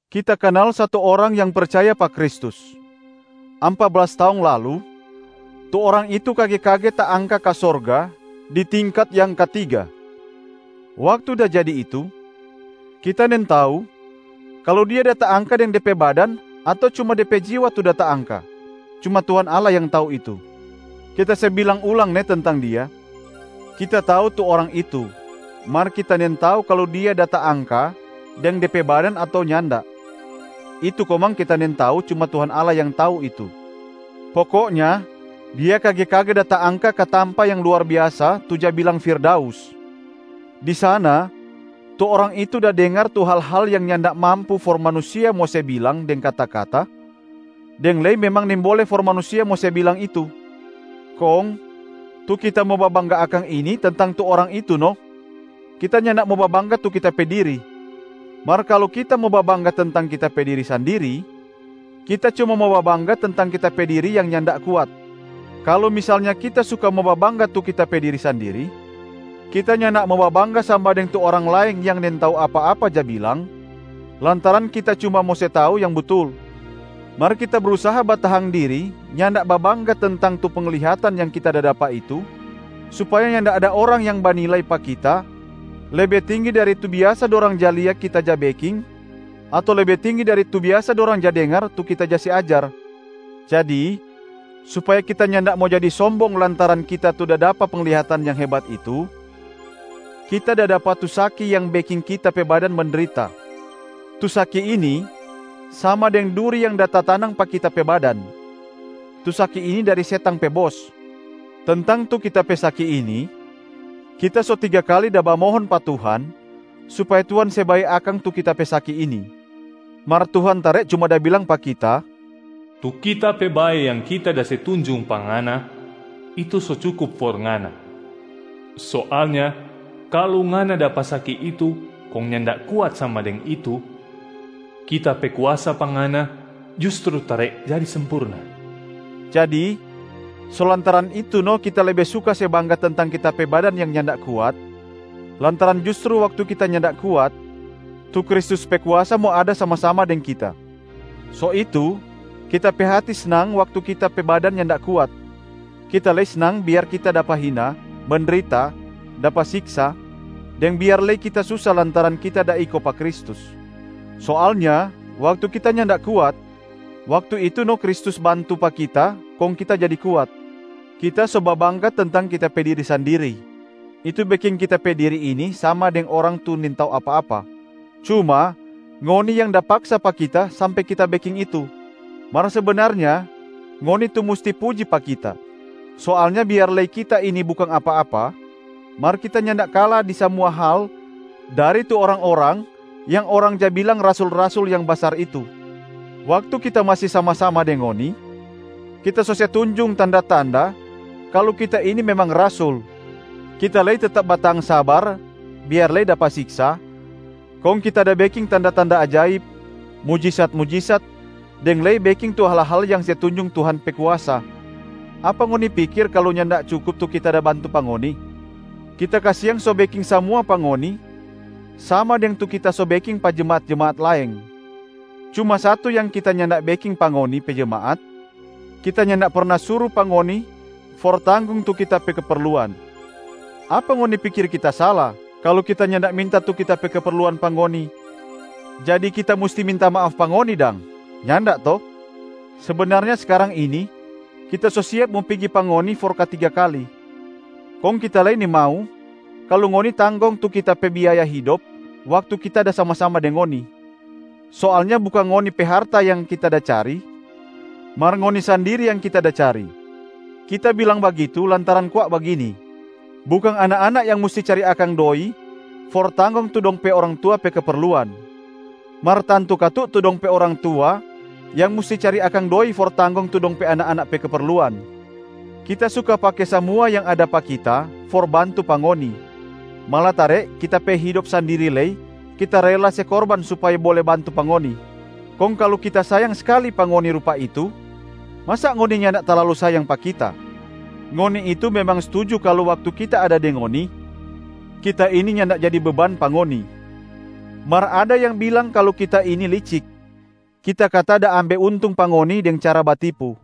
Kita kanal satu orang yang percaya pa Kristus. Ampa blas taong lalu, tu orang itu kage-kage taangka ka sorga di tingkat yang katiga. Waktu da jadi itu, kita nintau kalu dia da taangka deng de pe badan ato cuma de pe jiwa tu da taangka, cuma Tuhan Allah yang tau itu. Kita se bilang ulang ne tentang dia: kita tau tu orang itu, mar kita nintau kalu dia da taangka deng de pe badan ato nyanda, itu komang kita nintau, cuma Tuhan Allah yang tau itu. Pokoknya dia kage-kage da taangka ka tampa yang luar biasa tu ja bilang firdaus. Di sana, tu orang itu da dengar tu hal-hal yang nyanda mampu for manusia mo se bilang deng kata-kata, deng lei memang nimbole for manusia mo se bilang itu. Kong tu kita mo babangga akang ini tentang tu orang itu no, kita nyanda mo babangga tu kita pe diri. Mar kalu kita mo babangga tentang kita pe diri sandiri, kita cuma mo babangga tentang kita pe diri yang nyanda kuat. Kalu misalnya kita suka mo babangga tu kita pe diri sandiri, kita nyanda mo babangga sama deng tu orang laeng yang nintau apa-apa ja bilang, lantaran kita cuma mo se tau yang butul. Mar kita brusaha batahang diri nyanda babangga tentang tu penglihatan yang kita dapa itu supaya nyanda ada orang yang banilai pa kita lebe tinggi dari tu biasa dorang ja lia kita ja beking ato lebe tinggi dari tu biasa dorang ja dengar tu kita da se ajar. Jadi supaya kita nyanda mo jadi sombong lantaran kita tu da dapa penglihatan yang hebat itu, kita da dapa tu saki yang beking kita pe badan mendrita. Tu saki ini sama deng duri yang da tatanang pa kita pe badan. Tu saki ini dari setang pe bos. Tentang tu kita pe saki ini, kita so tiga kali da bamohon pa Tuhan supaya Tuhan se bae akang tu kita pe saki ini. Mar Tuhan tare cuma da bilang pa kita, “Tu Kita pe bae yang Kita da se tunjung pa ngana, itu so cukup for ngana. Soalnya kalu ngana dapa saki itu kong nyanda kuat sama deng itu, Kita pe kuasa pa ngana justru tare jadi sempurna.” Jadi so lantaran itu no kita lebe suka se bangga tentang kita pe badan yang nyanda kuat lantaran justru waktu kita nyanda kuat, tu Kristus pe kuasa mo ada sama-sama deng kita. So itu kita pe hati snang waktu kita pe badan nyanda kuat, kita lei snang biar kita dapa hina, mendrita, dapa siksa, deng biar lei kita susa lantaran kita da iko pa Kristus. Soalnya waktu kita nyanda kuat, waktu itu no Kristus bantu pa kita kong kita jadi kuat. Kita so babangga tentang kita pe diri sandiri, itu beking kita pe diri ini sama deng orang tu nintau apa-apa. Cuma ngoni yang da paksa pa kita sampe kita beking itu. Mar sebenarnya ngoni tu musti puji pa kita. Soalnya biar lei kita ini bukang apa-apa, mar kita nyanda kala di samua hal dari tu orang-orang yang orang ja bilang rasul-rasul yang basar itu. Waktu kita masi sama-sama deng ngoni, kita so se tunjung tanda-tanda kalu kita ini memang rasul, kita lei tetap batahang sabar biar lei dapa siksa kong kita da beking tanda-tanda ajaib, mujisat-mujisat deng lei beking tu hal-hal yang se tunjung Tuhan pe kuasa. Apa ngoni pikir kalu nyanda cukup tu kita da bantu pa ngoni? Kita kasiang so beking samua pa ngoni sama deng tu kita so beking pa jemaat-jemaat laeng. Cuma satu yang kita nyanda beking pa ngoni pe jemaat, kita nyanda perna suru pa ngoni for tanggong tu kita pe keperluan. Apa ngoni pikir kita sala kalu kita nyanda minta tu kita pe keperluan pa ngoni jadi kita musti minta maaf pa ngoni dang? Nyanda to? Sebenarnya skarang ini, kita so siap mo pigi pa ngoni for katiga kali. Kong kita lei nimau kalu ngoni tanggong tu kita pe biaya hidop waktu kita da sama-sama deng ngoni. Soalnya bukang ngoni pe harta yang kita da cari, mar ngoni sandiri yang kita da cari. Kita bilang bagitu lantaran kwa bagini: bukang anak-anak yang musti cari akang doi for tanggong tu dong pe orang tua pe keperluan, mar tantu katu tu dong pe orang tua yang musti cari akang doi for tanggong tu dong pe anak-anak pe keperluan. Kita suka pake samua yang ada pa kita for bantu pa ngoni, malatare kita pe hidop sandiri lei kita rela se korban supaya bole bantu pa ngoni. Kong kalu kita sayang skali pa ngoni rupa itu, masa ngoni nyanda talalu sayang pa kita. Ngoni itu memang stuju kalu waktu kita ada deng ngoni, kita ini nyanda jadi beban pa ngoni. Mar ada yang bilang kalu kita ini licik, kita kata da ambe untung pa ngoni deng cara batipu.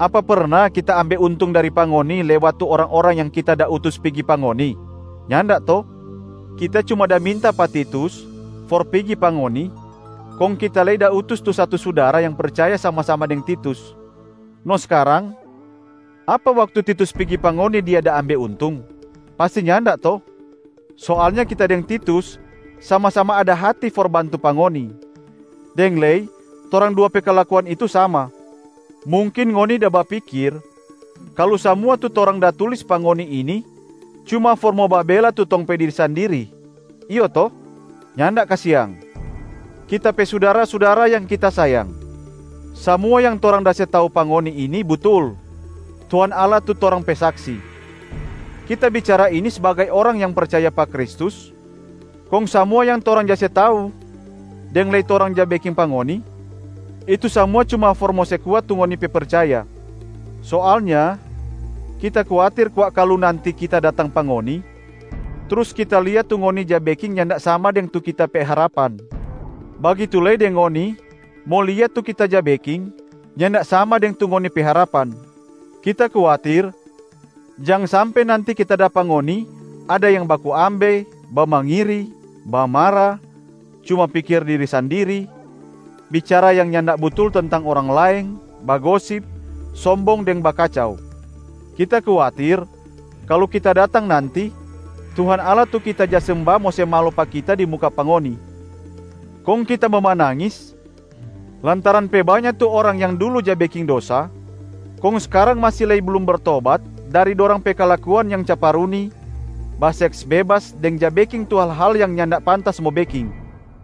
Apa perna kita ambe untung dari pa ngoni lewat tu orang-orang yang kita da utus pigi pa ngoni? Nyanda to? Kita cuma da minta pa Titus for pigi pa ngoni, kong kita lei da utus tu satu sudara yang percaya sama-sama deng Titus. No skarang, apa waktu Titus pigi pa ngoni, dia da ambe untung? Pasti nyanda to? Soalnya kita deng Titus sama-sama ada hati for bantu pa ngoni, deng lei torang dua pe kalakuan itu sama. Mungkin ngoni da bapikir kalu samua tu torang da tulis pa ngoni ini cuma for mo babela tu tong pe diri sandiri, iyo to? Nyanda kasiang. Kita pe sudara-sudara yang kita sayang, samua yang torang da se tau pa ngoni ini butul, Tuhan Allah tu torang pe Saksi. Kita bicara ini sbagai orang yang percaya pa Kristus, kong samua yang torang ja se tau deng lei torang ja beking pa ngoni, itu samua cuma for mo se kuat tu ngoni pe percaya. Soalnya kita kuatir kwa kalu nanti kita datang pa ngoni, trus kita lia tu ngoni ja beking nyanda sama deng tu kita pe harapan, bagitu lei deng ngoni mo lia tu kita ja beking nyanda sama deng tu ngoni pe harapan. Kita kuatir jang sampe nanti kita dapa ngoni ada yang baku ambe, bamangiri, bamara, cuma pikir diri sandiri, bicara yang nyanda butul tentang orang laeng, bagosip, sombong deng bakacau. Kita kuatir kalu kita datang nanti, Tuhan Allah tu kita ja semba mo se malo pa kita di muka pa ngoni. Kong kita mo manangis lantaran pe banya tu orang yang dulu ja beking dosa kong skarang masi lei blum bertobat dari dorang pe kalakuan yang caparuni, baseks bebas deng ja beking tu hal-hal yang nyanda pantas mo beking.